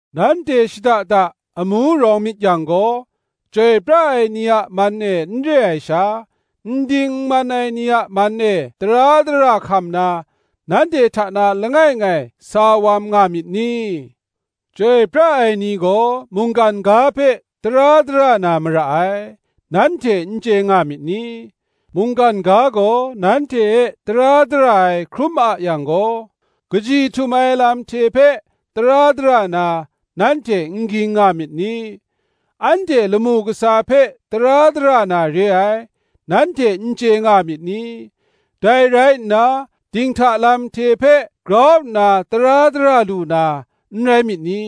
Nanhte shada da amu rawng myit yang gaw, chyoi pra ai ni a man e n re ai sha, n ding n man ai ni man e tara dara hkam na, nanhte hta na langai ngai sa wam nga myit ni? Chyoi pra ai ni gaw mungkan ga hpe tara dara na mara ai, nanhte n chye nga myit ni? Mungkan ga gaw nanhte e tara dara ai hkrum a yang gaw, kaji htum ai lam hte hpe tara dara na, nanhte n ging nga myit ni? Anhte lamu kasa hpe tara dara na re ai, nanhte n chye nga myit ni? dai rai nna, dinghta lam hte hpe grau nna tara dara lu na, n rai myit ni?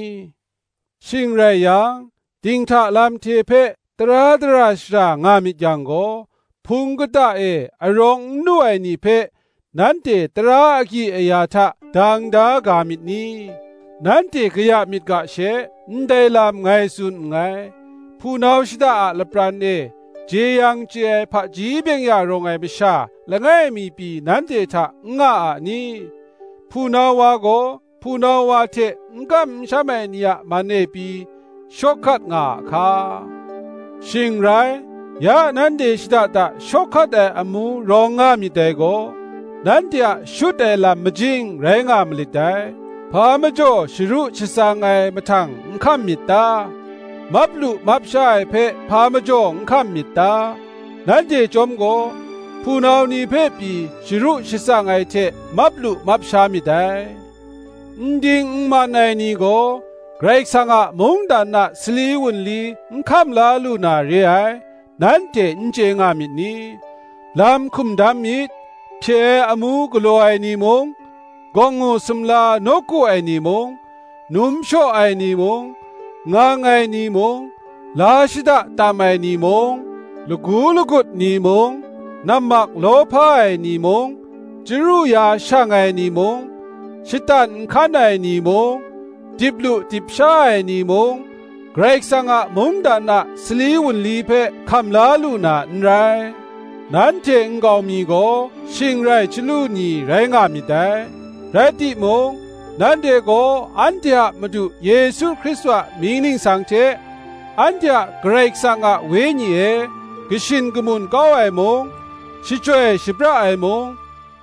Shing rai yang, dinghta lam hte hpe tara dara shara nga myit yang gaw, Hpung kata e arawng n lu ai ni hpe nanhte tara agyi aya hta dang da ga myit ni? Nanhte kaya myit ga she ndai lam ngai tsun nngai. Hpunau shada a lapran e jeyang chye ai hpaji byeng-ya rawng ai masha langai mi pyi nanhte hta n nga a ni? Hpunau wa gaw hpunau wa hte n kam n sham ai ni a man e pyi, shawk hkat nga a hka? Shing rai, ya nanhte shada da shawk hkat ai amu rawng nga myit dai gaw, nanhte a shut ai lam majing rai nga malit dai. Hpa majaw sharu shatsang ai mahtang n hkam myit ta? Map lu map sha ai hpe hpa majaw n hkam myit ta? Nanhte chyawm gaw, hpunau ni hpe pyi, sharu shatsang ai hte map lu map sha myit dai. N ding n man ai ni gaw Karai Kasang a mungdan a sali wunli n hkam la lu na re ai, nanhte n chye nga myit ni? Lam hkum dam myit: hpye ai amu galaw ai ni mung, gawngngu sumla nawku ai ni mung, num shaw ai ni mung, ngang ai ni mung, la shada tam ai ni mung, lagu lagut ni mung, nammak lawhpa ai ni mung, chyaru ya shang ai ni mung, shatan nhkan ai ni mung, dip lu dip sha ai ni mung, Karai Kasang a mungdan a sali wunli hpe hkam la lu n rai. Nanhte nkau mi gaw shing rai chyalu ni rai nga myit dai: rai timung, nanhte gaw anhte a Madu Yesu Hkristu a mying ningsang hte, anhte a Karai Kasang a Wenyi e kashin kamun kau ai mung, shachyoi shapra ai mung,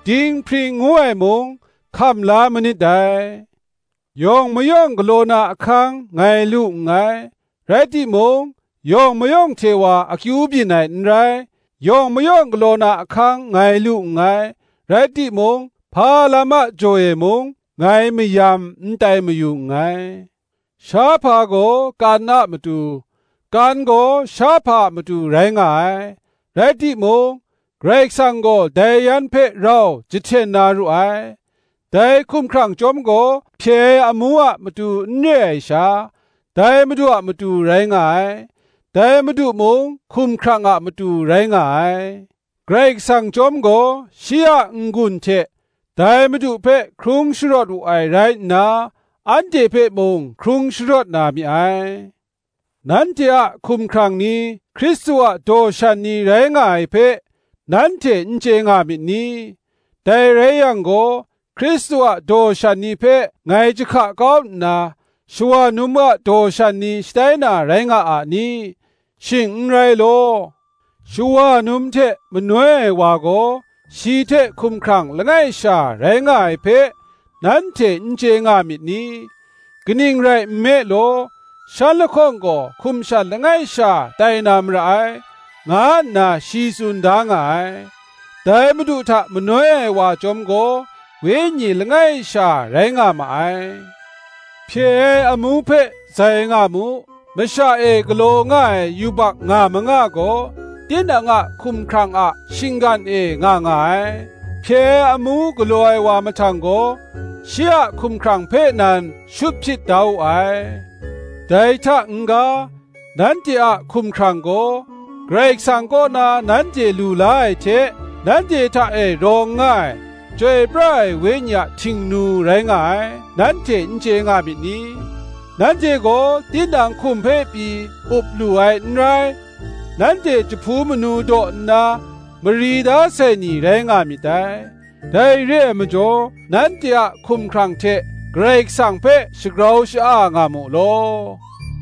dinghpring ngu ai mung, hkam la manit dai. Yawng mayawng galaw na ahkang ngai lu nngai; rai timung, yawng mayawng hte wa akyu byin ai n rai. Yawng mayawng galaw na ahkang ngai lu nngai; rai timung, hpa lam a jaw e mung, ngai mayam n tai mayu nngai. Shahpa gaw kan a matu, kan gaw shahpa a matu rai nga ai; rai timung, Karai Kasang gaw dai yan hpe rau jahten na ru ai. Dai hkumhkrang chyawm gaw hpye ai amu a matu n re ai sha, dai Madu a matu rai nga ai; dai Madu mung hkumhkrang a matu rai nga ai: Karai Kasang chyawm gaw shi a n-gun hte dai Madu hpe hkrung sharawt wu ai rai nna, anhte hpe mung hkrung sharawt na mi ai. Nanhte a hkumhkrang ni Hkristu a daw shan ni rai nga ai hpe, nanhte n chye nga myit ni? Dai rai yang gaw, Hkristu a daw shan ni hpe ngai jahka kau nna shawa num a daw shan ni shatai na rai nga a ni? Shing n rai law. Shawa num hte manoi ai wa gaw, shi hte hkumhkrang langai sha rai nga ai hpe, nanhte n chye nga myit ni? Kaning rai nme law, Shan lahkawng gaw hkum shan langai sha tai na mara ai, nga nna shi tsun da nga ai. Dai Madu hta manoi ai wa chyawm gaw, Wenyi langai sha rai nga ma ai. Hpye ai amu hpe zai nga mu: masha e galaw nga ai yubak nga manga gaw, tinang a hkumhkrang a shinggan e nga nga ai; hpye ai amu galaw ai wa mahtang gaw, shi a hkumhkrang hpe nan shut hpyit da wu ai. Dai hta n-ga, nanhte a hkumhkrang gaw, Karai kasang kaw na nanhte lu la ai hte, nanhte hta e rawng nga ai Chyoi pra ai Wenyi a htingnu rai nga ai, nanhte n chye nga myit ni? Nanhte gaw tinang hkum hpe pyi up lu ai n rai; nanhte jahpu manu daw nna mari da sai ni rai nga myit dai: dai re ai majaw, nanhte a hkumhkrang hte Karai Kasang hpe shagrau sha-a nga mu law.